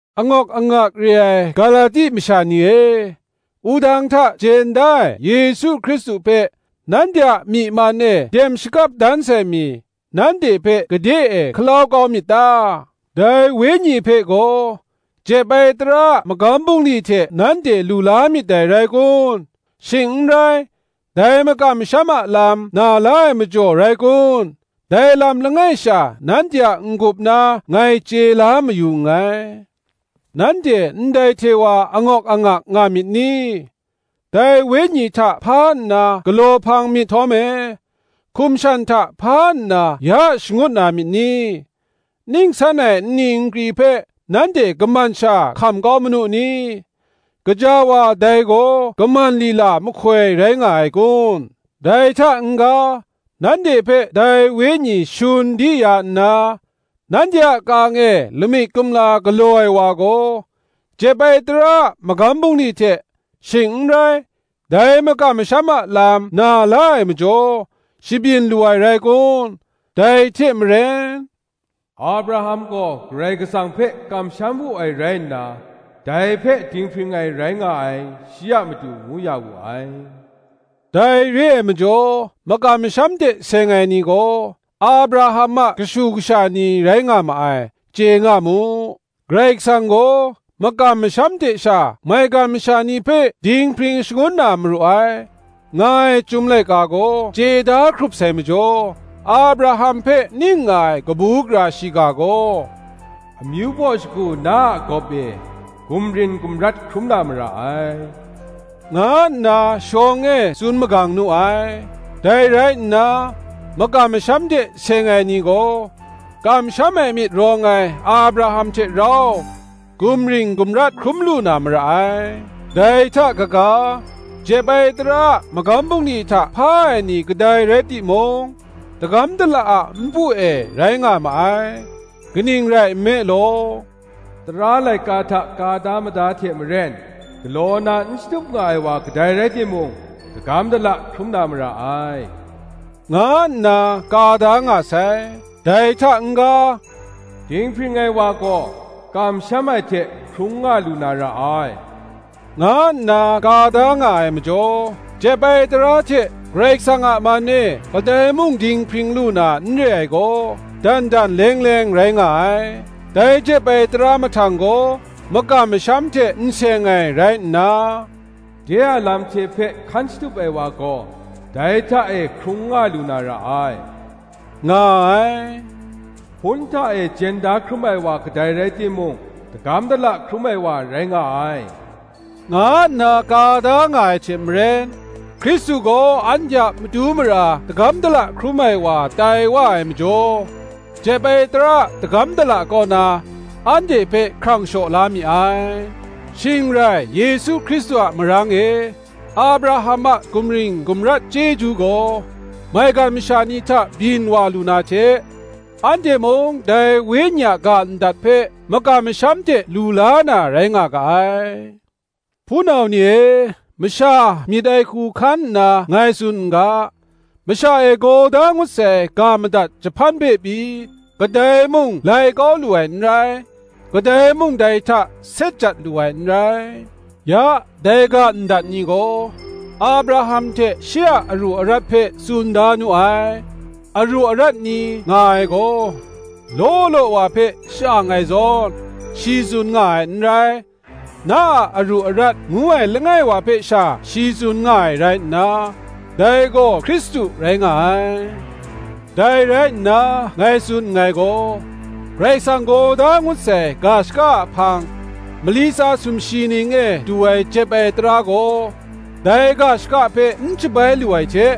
Angawk angak re ai Galati masha ni e, wudang hta jen da ai Yesu Hkristu hpe nanhte a myi man e dem shakap dan sai mi, nanhte hpe gade e hkalau kau myit ta? Dai Wenyi hpe gaw jep ai tara a magam bungli hte nanhte lu la myit dai rai kun? shing n rai, dai makam masham a lam na la ai majaw rai kun? dai lam langai sha nanhte a n-gup na ngai chye la ma yu nngai. Nanhte ndai hte wa angawk angak nga myit ni? Dai Wenyi hta hpa nna galaw hpang myit htawm e, hkum shan hta hpa nna ya shangut na myit ni? Ning san ai nni nkri hpe nanhte kaman sha hkam kau manu ni? gaja wa, dai gaw kaman lila mahkoi rai nga ai kun. Dai hta n-ga, nanhte hpe dai Wenyi shun di ya nna, nanhte a ka-ang e lamik kumla galaw ai wa gaw, jep ai tara a magam bungli hte, shing n rai, dai makam masham a lam na la ai majaw, shabyin lu ai rai kun? Dai hte maren, Abraham gaw Karai Kasang hpe kamsham wu ai rai nna, dai hpe dinghpring ai rai nga ai, shi a matu ngu ya wu ai. Dai re ai majaw, makam masham hte seng ai ni gaw Abraham a kashu kasha ni rai nga ma ai, chye nga mu. Karai Kasang gaw makam masham hte sha maigan masha ni hpe dinghpring shangun na maru ai, nga ai Chyum laika gaw chye da hkrup sai majaw, Abraham hpe ning nga ai kabu gara shiga gaw, Amyu baw shagu gaw na a gawp e gumring gumrat hkrum na mara ai, nga nna shawng e tsun magang nu ai. Dai rai nna, makam masham hte seng ai ni gaw, kamsham ai myit rawng ai Abraham hte rau gumring gumrat hkrum lu na mara ai. Dai hta kaga, jep ai tara a magam bungli hta hpa ai ni kadai rai timung, dagam dala a npu e rai nga ma ai: kaning rai nme law, Tara laika hta ka da mada hte maren galaw na n shatup nga ai wa kadai rai timung, dagam dala hkrum na mara ai, nga nna ka da nga sai. Dai hta n-ga, Dinghpring ai wa gaw kamsham ai hte hkrung nga lu na ra ai, nga nna ka da nga ai majaw, jep ai tara hte Karai Kasang a man e kadai mung dinghpring lu na n re ai gaw, dan dan leng leng rai nga ai. Dai jep ai tara mahtang gaw, makam masham hte n seng ai rai nna, De a lam hte hpe hkan shatup ai wa gaw, dai hta e hkrung nga lu na ra ai, nga ai. Hpun hta e jen da hkrum ai wa kadai rai timung dagam dala hkrum ai wa rai nga ai, nga nna ka da nga ai hte maren, Hkristu gaw anhte a matu mara dagam dala hkrum ai wa tai wa ai majaw jep ai tara a dagam dala kaw na anhte hpe hkrang shaw la mi ai: shing rai Yesu Hkristu a marang e, Abraham a gumring gumrat chyeju gaw maigan masha ni hta byin wa lu na hte, anhte mung dai Wenyi a ga ndat hpe makam masham hte lu la na rai nga ga ai. Hpunau ni e, masha myit ai hku hkan nna ngai tsun n ga: Masha e gaw da ngut sai ga ndat jahpan hpe pyi, kadai mung lai kau lu ai n rai, kadai mung dai hta set jat lu ai n rai. Ya, dai ga ndat ni gaw Abraham hte shi a aru arat hpe tsun da nu ai. Aru arat ni nga ai gaw, law law wa hpe sha-ang ai zawn, shi tsun nga ai n rai: Na a aru arat ngu ai langai wa hpe sha shi tsun nga ai rai nna, dai gaw Hkristu rai nga ai. Dai rai nna ngai tsun nngai gaw, Karai Kasang gaw da ngut sai ga shaka a hpang, mali tsa sumshi ning e du ai jep ai tara gaw, dai ga shaka hpe n shabai lu ai hte,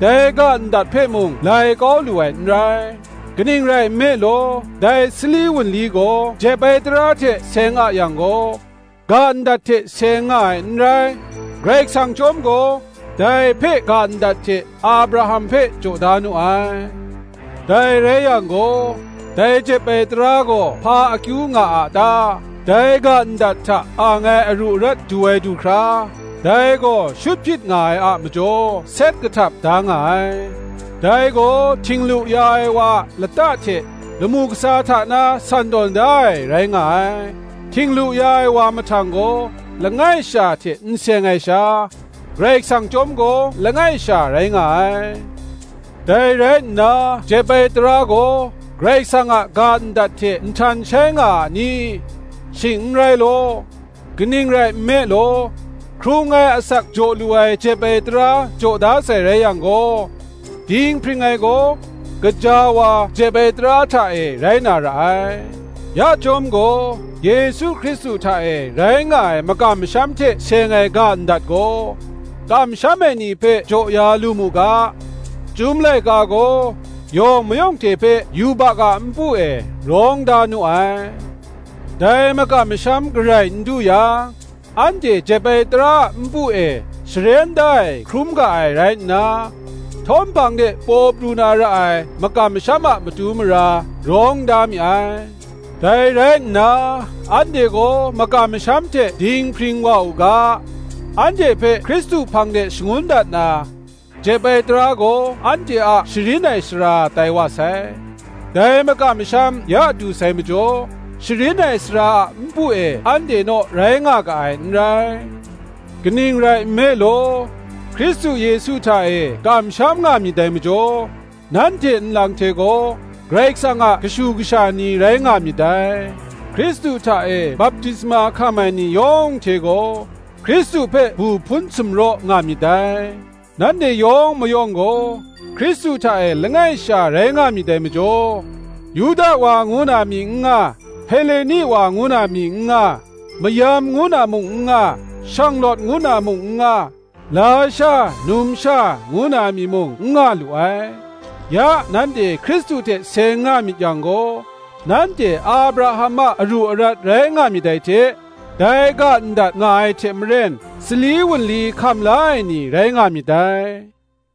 dai ga ndat hpe mung lai kau lu ai, n rai. Kaning rai nme law, dai sali wunli gaw jep ai tara hte seng a yang gaw, ga ndat hte seng nga ai n rai; Karai Kasang chyawm gaw, dai hpe ga ndat hte Abraham hpe jaw da nu ai. Dai rai yang gaw, dai jep ai tara gaw hpa akyu nga a ta? dai ga ndat hta ang ai aru arat du ai du hkra, dai gaw shut hpyit nga ai a majaw set kahtap da nga ai: dai gaw htinglu ya ai wa a lata hte lamu kasa hta na san tawn da ai rai nga ai. Htinglu ya ai wa mahtang gaw, langai sha hte n seng ai sha, Karai Kasang chyawm gaw langai sha rai nga ai. Dai rai nna jep ai tara gaw Karai Kasang a ga ndat hte nhtan shai nga a ni? Shing n rai law; kaning rai nme law, hkrung ai asak jaw lu ai jep ai tara jaw da sai rai yang gaw, dinghpring ai gaw, gaja wa, jep ai tara hta e rai na ra ai. Ya chyawm gaw, Yesu Hkristu hta e rai nga ai makam masham hte seng ai ga ndat gaw, kamsham ai ni hpe jaw ya lu mu ga, Chyum laika gaw yawng mayawng hte hpe yubak a npu e rawng da nu ai. Dai makam masham garai n du yang, anhte jep ai tara a npu e sharen da ai hkrum ga ai rai nna, htawm hpang de paw pru na ra ai makam masham a matu mara, rawng da mi ai. Dai rai nna, anhte gaw makam masham hte dinghpring wa u ga, anhte hpe Hkristu hpang de shangun dat na, jep ai tara gaw anhte a sharin ai sara tai wa sai. Dai makam masham ya du sai majaw, sharin ai sara a npu e anhte naw rai nga ga ai n rai. Kaning rai nme law, Hkristu Yesu hta e kamsham nga myit dai majaw, nanhte nlang hte gaw, Karai Kasang a kashu kasha ni rai nga myit dai. Hkristu hta e baptisma hkam ai ni yawng hte gaw, Hkristu hpe bu hpun sumraw nga myit dai. Nanhte yawng mayawng gaw Hkristu hta e langai sha rai nga myit dai majaw, Yuda wa ngu na mi n nga, Heleni wa ngu na mi n nga; mayam ngu na mung n nga, shanglawt ngu na mung n nga; lasha, numsha ngu na mi mung n nga lu ai. Ya nanhte Hkristu hte seng nga myit yang gaw, nanhte Abraham a aru arat rai nga myit dai hte, dai ga ndat nga ai hte maren, sali wunli hkam la ai ni rai nga myit dai.